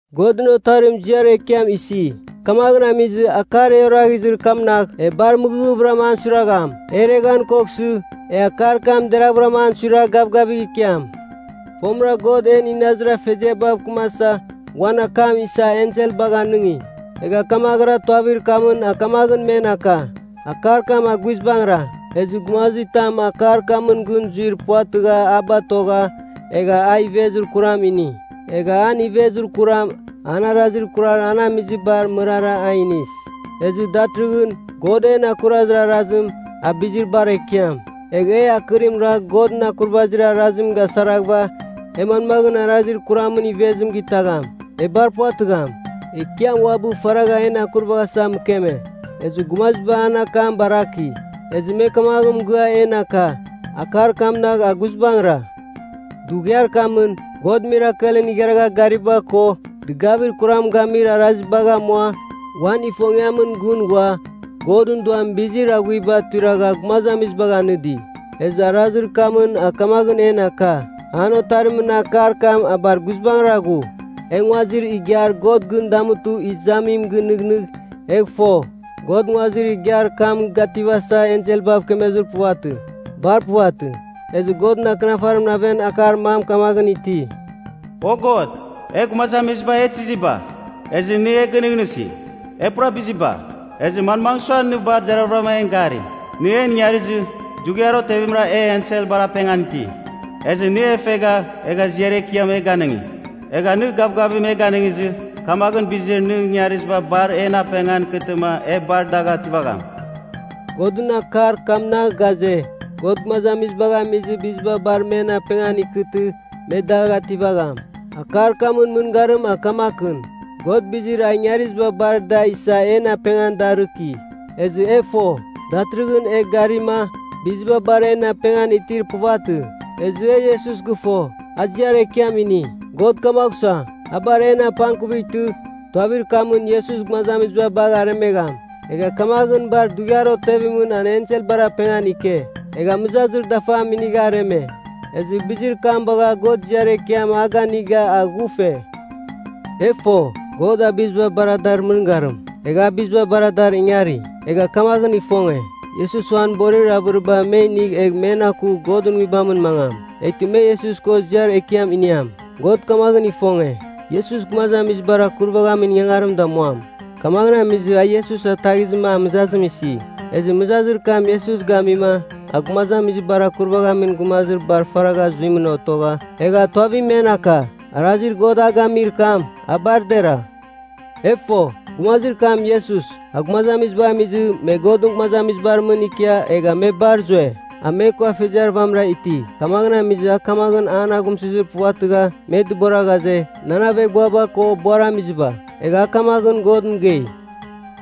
Godɨn Otarim ziar ekiam isi, kamaghɨn amizɨ, akar e oraghizir kamnagh, e bar mɨghɨvɨram an suiragham. E ireghan koghsɨ, e akar kam deraghvɨra an suiragh gavgavigh ikiam. Fomɨra God en inazir afeziaba mɨkɨmasa, uan akam isa enselbagh anɨngi, egha kamaghɨra tuavir kamɨn a kamaghɨn men aka, akar kam a guizbangɨra. Ezɨ gumazitam akar kamɨn gɨn zuir puvatɨgha a batogha, egha a ivezir kuram ini. Egha an ivezir kuram, an arazir kurar an amizibar mɨrara a inis. Ezɨ datɨrɨghɨn, God en akurazir arazim, a bizir bar ekiam. Egh e akɨrim ragh Godɨn akurvazir arazim gasaraghɨva, e manmaghɨn arazir kuramɨn ivezim gitagham. E bar puvatɨgham. Ekiam uabɨ faragha en akurvaghasa mɨkeme, ezɨ gumaziba an akam baraki. Ezɨ me kamaghɨn mɨgɨa en aka, akar kamnagh a guizbangɨra. Dughiar kamɨn, God mirakelɨn igharagha gariba ko dɨgavir kuram gamir arazibagh amua uan ifongiamɨn gɨn ghua Godɨn Duamɨn bizir aghuiba tuiragha gumazamiziba ganɨdi. Ezɨ arazir kamɨn a kamaghɨn en aka, an Otarimɨn akar kam a bar guizbangɨra ghu. E nguazir igiar God gɨn damutɨ izamim gɨnɨghnɨgh, egh fo, God nguazir igiar kam gativasa, enselbav kemezir puvatɨ. Bar puvatɨ. Ezɨ Godɨn Akɨnafarimɨn aven akar mam kamaghɨn iti, “O God! E gumazamiziba e tiziba, ezɨ nɨ e gɨnɨghnɨsi? E pura biziba. Ezɨ manmagh sua nɨ bar deraghavɨra en gari? Nɨ en ingarizɨ, dughiar otevimra e enselbar apengan iti; ezɨ nɨ e fegha egha ziar ekiam e ganɨngi. Egha nɨ gavgavim e ganɨngizɨ, kamaghɨn bizir nɨ ingariziba bar en apengan ikɨtɨma e bar dagh ativagham.” Godɨn akar kamnagh ghaze, God gumazamiziba gamizɨ, biziba bar men apengan ikɨtɨ me dagh ativagham. Akar kamɨn mɨngarim a kamakɨn, God bizir a ingariziba bar da isa en apengan darɨki. Ezɨ e fo, datɨrɨghɨn e garima, biziba bar en apengan itir puvatɨ. Ezɨ e Iesus gɨfo, a ziar ekiam ini. God kamagh sua, a bar en apangkuvightɨ, tuavir kamɨn Iesus gumazamiziba bagh aremegham. Egha kamaghɨn bar dughiar otevimɨn an enselbar apengan ike. Egha mɨzazir dafam inigha areme, ezɨ bizir kam bagha God ziar ekiam a ganiga a ghufe. E fo, God a biziba bar dar mɨngarim, egha a biziba bar dar ingari. Egha kamaghɨn ifonge, Iesus uan borir avɨriba me inigh egh men aku Godɨn Nguibamɨn mangam, eghtɨ me Iesus ko ziar ekiam iniam. God kamaghɨn ifonge, Iesus gumazamizibar akurvaghamin ingangarim damuam, kamaghɨn amizɨ a Iesus ataghizɨma a mɨzazim isi. Ezɨ mɨzazir kam Iesus gamima a gumazamizibar akurvaghamin gumazir bar faragha zuimɨn otogha, egha tuavim men aka. Arazir God a gamir kam, a bar dera. E fo, gumazir kam Iesus, a gumazamiziba gamizɨ me Godɨn gumazamiziba mɨn ikia egha me bar zue. A me ko afeziar vamɨra iti. Kamaghɨn amizɨ a kamaghɨn an aghumsɨzir puvatɨgha me dɨbora ghaze, “Nan aveghbuaba ko buaramiziba.” Egha a kamaghɨn God mɨgei,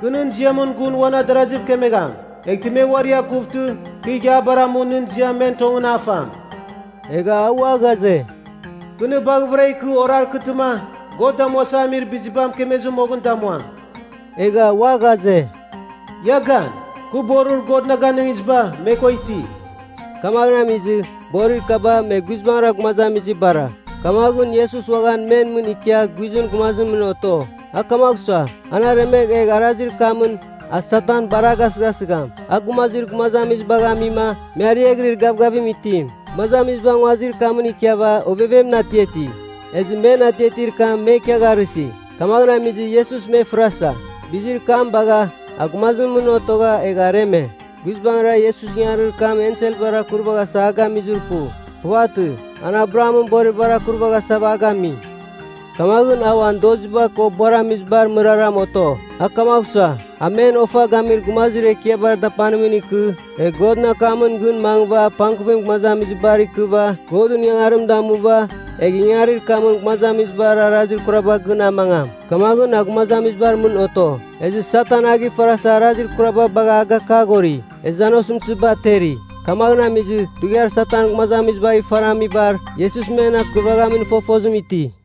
“Kɨ nɨn ziamɨn gun uan adaraziv kemegham. Eghtɨ me uari akuvtɨ kɨ ighiabar amu nɨn ziam men tongɨn a fam.” Egha a ua ghaze, “Kɨ nɨ baghɨvɨra ikɨ orarkɨtɨma God damuasa amir biziba mɨkemezɨ moghɨn damuam.” Egha ua ghaze, “Ia gan, kɨ borir God na ganɨngiziba me ko iti.” Kamaghɨn amizɨ, borir kaba, me guizbangɨra gumazamizibara. Kamaghɨn Iesus uaghan men mɨn ikia guizɨn gumazimɨn oto. A kamagh sua, an aremegh egh arazir kamɨn a Satan bar a gasɨghasɨgham, a gumazir gumazamizibagh amima me ariaghɨrir gavgavim itim. Gumazamiziba nguazir kamɨn ikiava ovevemɨn atiati. Ezɨ men atiatir kam me ikiagharɨsi. Kamaghɨn amizɨ, Iesus me fɨrasa, bizir kam bagha, a gumazimɨn mɨn otogha egha areme. Guizbangɨra, Iesus ingangarir kam enselbar akurvaghasa a gamizir pu. Puvatɨ. An Abrahamɨn boriba akurvaghasa a gami. Kamaghɨn, a uan doziba ko buaramizibar mɨrara oto. A kamagh sua, a men ofa gamir gumazir ekiabar dapanimɨn ikɨ, egh Godɨn akamɨn gɨn mangɨva apangkuvim gumazamizibar ikɨva Godɨn ingangarim damuva, egh ingangarir kamɨn gumazamizibar arazir kurabar gɨn amangam. Kamaghɨn a gumazamizibar mɨn oto. Ezɨ Satan a gifarasa arazir kuraba bagha a gakaghori, ezɨ an osɨmtɨziba ateri. Kamaghɨn amizɨ, dughiar Satan gumazamizibagh ifaramibar, Iesus men akurvaghamin fofozim iti.